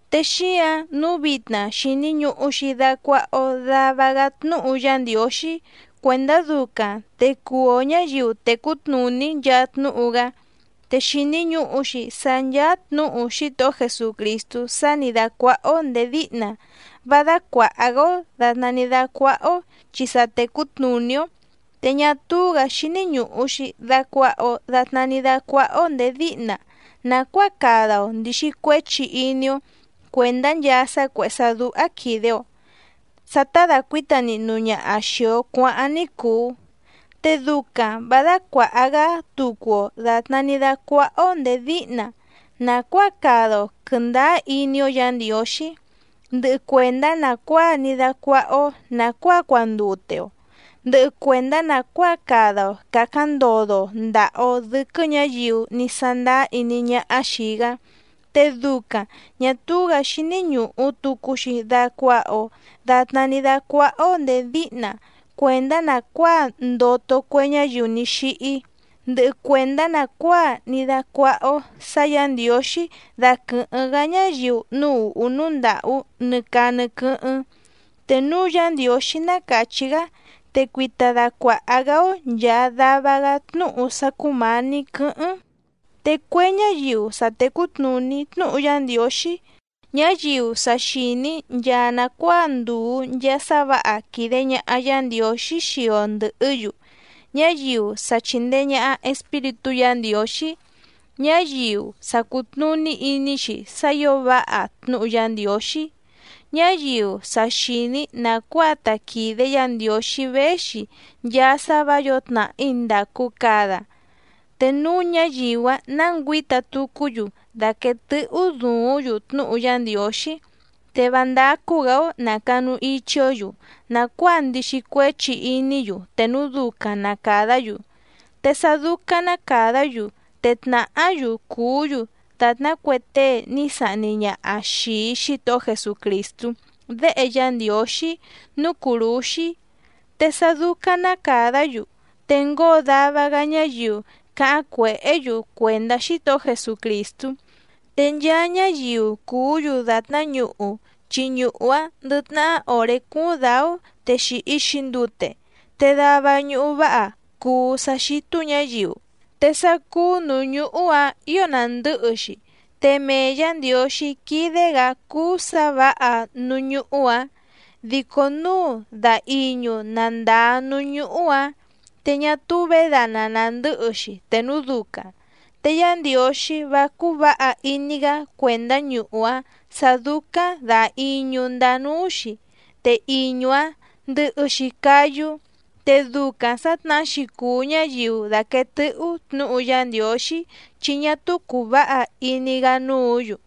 Te xíǎⁿ nǔu vitna xìni ñuhu‑xi dacuaha‑o dava‑gá tnúhu Yá Ndiǒxí cuèndá ducaⁿ te cuu‑o ñǎyiu tècú tnùní nchaa tnúhu‑gá. Te xìni ñuhu‑xi sá ncháá tnǔhu Xítohó Jesucrìstú sá nǐ dácuáhá‑ó ndèé díhna vá dácuàha‑gá‑ó dàtná ní dácuáhá‑ó chi sa tècú tnùní‑ó. Te ñá túú‑gǎ xíní ñùhu‑xi dacuaha‑o datná ní dácuáhá‑ó ndèé díhna nàcuáa cada‑o ndìxi cuéchi iní‑ó cuèndá nchaa sá cuèhé sá dúhá quìde‑o, sá tá dàcuíta nihnu ñaha xìi‑o cuáháⁿ ní cùu. Te ducaⁿ vǎ dácuàha‑gá tucu‑o dàtná ní dácuáhá‑ó ndèé díhna nàcuáa cada‑o quɨ̀ndáá iní‑ó Yǎ Ndiǒxí, ndɨhɨ cuèndá nàcuáa ní dácuáhá‑ó nàcuáa cuandute‑o, ndɨhɨ cuèndá nàcuáa cada‑o càcáⁿ ndodo‑o ndàha‑o dɨ́quɨ́ ñǎyiu ní sándáá iní ñáhá xìi‑gá. Te ducaⁿ ñà túú‑gǎ xíní ñùhu tucu‑xi dacuaha‑o datná ní dácuáhá‑ó ndèé díhna cuèndá nàcuáa ndoto cue ñáyiu ní xíhí, ndɨhɨ cuèndá nàcuáa ní dácuáhá‑ó sǎ Yǎ Ndiǒxí daquɨ̀hɨ́ⁿ‑gá ñáyiu núú ùhú núú ndàhú nɨ caa nɨ quɨ́hɨ́ⁿ. Te núu Yá Ndiǒxí ná càchí‑gá, te cuita dacuàha‑gá‑ó nchàa dava‑gá tnúhu sá cúmǎní quɨ̌hɨ́ⁿ. Te cue ñáyiu sa tècú tnùní tnúhu Yá Ndiǒxí, ñáyiu sa xìní nchaa nàcuáa ndùu nchaa sá vǎha quìde ñaha Yá Ndiǒxí xii‑o ndɨ̀hɨ́‑yu, ñáyiu sa chìndee ñaha Espíritú Yǎ Ndiǒxí, ñáyiu sa cùtnuní iní‑xi sá ǐo váha tnúhu Yá Ndiǒxí, ñáyiu sa xìní nàcuáa ta quìde Yá Ndiǒxí véxi nchaa sá vǎ yǒo tnàhí ndàcu cada, te núu ñáyiu‑áⁿ ná ngüǐta tucú‑yu daquèe tɨ́hú duúⁿ‑yu tnúhu Yá Ndiǒxí, te vá ndácú‑gǎ‑ó nà canu ichi‑ó‑yu nàcuáa ndixi cuéchi iní‑yu te núu ducaⁿ na càdá‑yu, te sá dúcáⁿ ná càdá‑yu te tnàhá‑yu cùú‑yu dàtná cue tée ní sahni ñaha xìi Xítohó Jesucrìstú Déhe Yá Ndiǒxí núú cùrúxí. Te sá dúcáⁿ ná càdá‑yu te ngóo dava‑gá ñáyiu cáháⁿ cuèhé‑yu cuèndá Xítohó Jesucrìstú. Te nchaa ñáyiu cùú‑yu dàtná ñuhu, chi ñuhu‑áⁿ ndɨ tnahá òré cúúⁿ dǎú te xìhi‑xi ndute, te dava ñuhu váha cùu sá xítú ñǎyiu, te sá cúú nǔú ñuhu‑áⁿ ǐo nàndɨ́hɨ‑xi, te mee Yǎ Ndiǒxí quídé‑gǎ cúú sǎ vǎha núú ñúhú‑ǎⁿ. Dico núu da iñu na ndàa núú ñuhu‑áⁿ te ñá túú vědana nàndɨ́hɨ‑xi te núu ducaⁿ, te Yá Ndiǒxí vá cúú vǎha iní‑gá cuèndá ñuhu‑áⁿ sǎ dúcáⁿ dà iñu ndaa núú‑xi, te iñu‑áⁿ ndɨhɨ‑xi cáyú. Te ducaⁿ sǎtnahá‑xi cùu ñáyiu dàquee tɨ́hú tnǔhu Yá Ndiǒxí chi ñá túú cùu váha iní‑gá núǔ‑yu.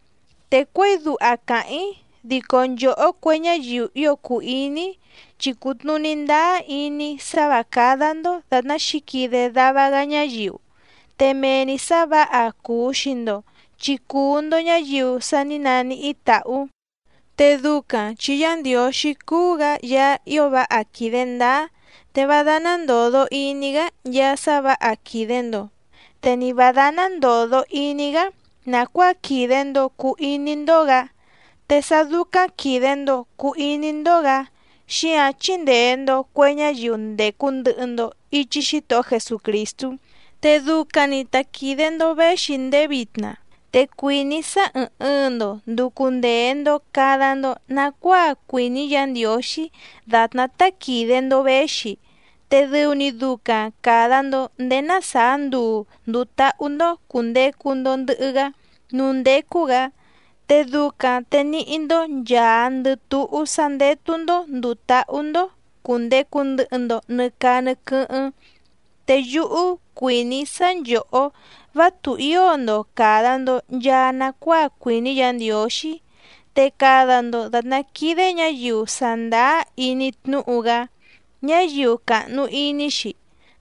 Te cuěi duha càháⁿ‑í dico nchòhó cue ñáyiu ío cùu iní‑í, chi cùtnuní ndáá iní‑í sá vǎ cádá‑ndó dàtná xǐquide dava‑gá ñáyiu, te mee‑ni sǎ vǎha cuu xii‑ndo chi cùu‑ndo ñáyiu sa ní naníhí tàhú. Te ducaⁿ chi Yá Ndiǒxí cúú‑gǎ Yaá ío váha quìde ndáá, te vá dáná ndòdo iní‑gá nchaa sá vǎha quìde‑ndo, te ni vǎ dáná ndòdo iní‑gá nàcuáa quìde‑ndo cuu iní‑ndó‑gǎ, te sá dúcáⁿ quìde‑ndo cuu iní‑ndó‑gǎ xíǎⁿ chíndèe‑ndo cue ñáyiu ndècu ndɨhɨ‑ndo ichi Xítohó Jesucrìstú, te ducaⁿ‑ni ta quìde‑ndo véxi ndéé vitna. Te cuìní‑í sá ɨ̀ɨⁿ ɨɨⁿ‑ndo nducu ndee‑ndo cada‑ndo nacuáa cuìní Yǎ Ndiǒxí dàtná tá quìde‑ndo véxi, te dɨu‑ni ducaⁿ càda‑ndo ndéé ná sàá nduu ndùu táhú‑ndó cùndecu‑ndo ndɨhɨ‑gá núú ndécú‑gǎ, te ducaⁿ te níhí‑ndó nchàandɨ túhú sá ndétú‑ndó ndùu táhú‑ndó cùndecu ndɨhɨ‑ndo nɨ caa nɨ quɨ́hɨ́ⁿ. Te yúhú cuìní‑í sá nchòhó vá tùhío‑ndo càda‑ndo nchaa nacuáa cuìní Yǎ Ndiǒxí, te cada‑ndo dàtná quídé ñǎyiu sàndáá iní tnúhu‑gá, ñáyiu càhnu iní‑xi.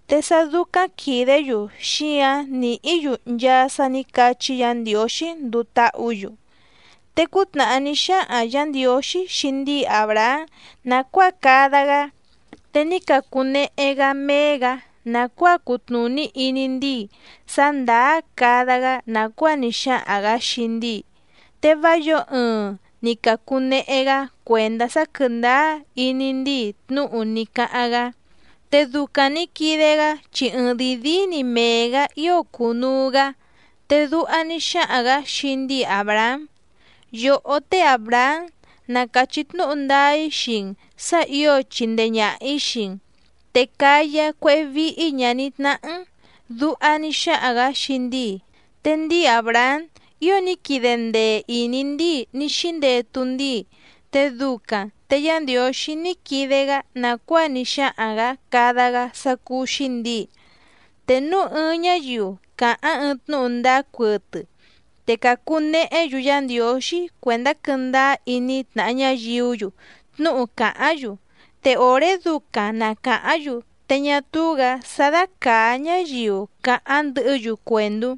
Te sá dúcáⁿ quìdé‑yu xíǎⁿ nìhí‑yu nchaa sá nǐ cachí Yǎ Ndiǒxí nduu táhǔ‑yu. Te cútnàhá ní xáhaⁿ Yǎ Ndiǒxí xii ndíi Àbrahám nàcuáa cada‑gá, te ní cacunehe‑gá méé‑gǎ nàcuáa cutnùní iní ndíi sá ndàá cada‑gá nàcuáa ní xáhaⁿ‑gǎ xii ndíi, te vá yǒo ɨɨⁿ ni càcunehe‑gá cuèndá sá quɨ̀ndáá iní ndíi tnúhu ní cáháⁿ‑gá. Te ducaⁿ nǐ quide‑gá chi ɨɨⁿdìi díí‑ni mee‑gǎ ío cùnuu‑gá. Te duha ní xáhaⁿ‑gǎ xii ndíi Àbrahám: “Yòhó té Àbrahám na càchí tnúhu ndáá‑í xii‑n sǎ ǐo chindee ñàha‑í xii‑n, te cáyá cuéhé víhí ñàní tnáhá‑n”, duha ní xáhaⁿ‑gǎ xii ndíi. Te ndíi Àbrahám ío ní quide ndee ìní ndíi ní xíndetu ndíi, te ducaⁿ te Yá Ndiǒxí ní quide‑gá nàcuáa ní xáhaⁿ‑gǎ cada‑gá sá cúú‑xí ndǐi. Te núu ɨɨⁿ ñáyiu càháⁿ ɨɨⁿ tnúhu ndáá cuɨtɨ te càcu nehé‑yu Yá Ndiǒxí cuèndá quɨ́ndáá iní tnàha ñáyiú‑yu tnúhu càháⁿ‑yu, te òré ducaⁿ na càháⁿ‑yu te ñá túú‑gǎ sá dácàá ñáyiu càháⁿ ndɨhɨ́‑yu cuèndú.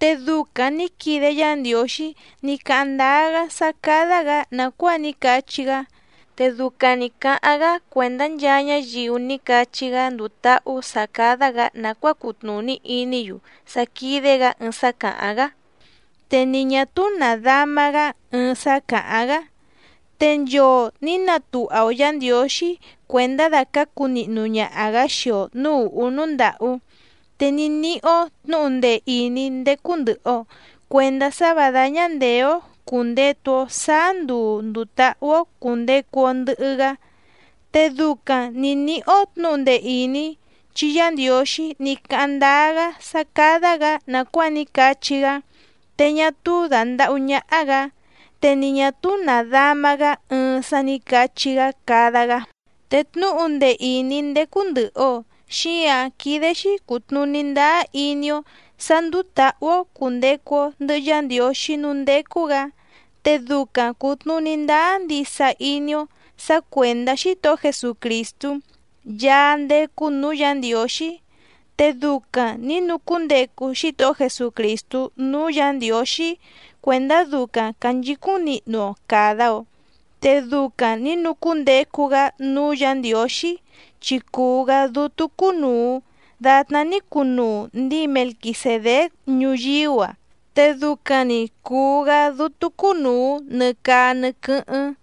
Te ducaⁿ nǐ quide Yá Ndiǒxí ní cáháⁿ ndáá‑gá sá cádá‑gǎ nàcuáa ní cachí‑gá, te ducaⁿ nǐ cáháⁿ‑gá cuèndá nchaa ñáyiu ní cachí‑gá nduu táhú sǎ cádá‑gǎ nàcuáa cutnùní iní‑yu sá quídé‑gǎ ɨɨⁿ sá càháⁿ‑gá, te ni ñà túú nàdáma‑gá ɨɨⁿ sá càháⁿ‑gá. Te nchoo nǐ natuha‑o Yǎ Ndiǒxí cuèndá dàcácu nihnu ñaha‑gǎ xii‑o nǔú ùhú núú ndàhú, te ní níhí‑ó tnǔhu ndee ìní ndécú ndɨ̀hɨ‑o cuendá sá vǎ dáñá ndèé‑ó cùndetu‑o sáá nduu ndùu táhú‑ó cùndecu‑o ndɨhɨ‑gá. Te ducaⁿ nǐ níhí‑ó tnǔhu ndee ìní chi Yá Ndiǒxí ní cáháⁿ ndáá‑gá sá cádá‑gǎ nàcuáa ní cachí‑gá, te ñá túú dàndahú ñáhá‑gǎ, te ni ñà túú nàdáma‑gá ɨɨⁿ sá nǐ cachí‑gá cada‑gá. Te tnúhu ndee ìní ndécú ndɨ̀hɨ‑o xíǎⁿ quídé‑xí cùtnuní ndáá iní‑ó sǎ ndúú tǎhú‑ó cùndecu‑o ndɨhɨ Yá Ndiǒxí núú ndécú‑gǎ, te ducaⁿ cùtnuní ndáá ndisa iní‑ó sǎ cuèndá Xítohó Jesucrìstú Yaá ndécú nǔú Yǎ Ndiǒxí. Te ducaⁿ nǐ nucúndecu Xítohó Jesucrìstú núú Yǎ Ndiǒxí cuèndá ducaⁿ cànchicúⁿ nihnu‑o càda‑o, te ducaⁿ nǐ nucúndecu‑gá núú Yǎ Ndiǒxí chi cùu‑gá dútú cúnùu datná ní cunuu ndíi Melquisèdéc ñuyíú‑a, te ducaⁿ‑ni cùu‑gá dútú cúnùu nɨ caa nɨ quɨ́hɨ́ⁿ.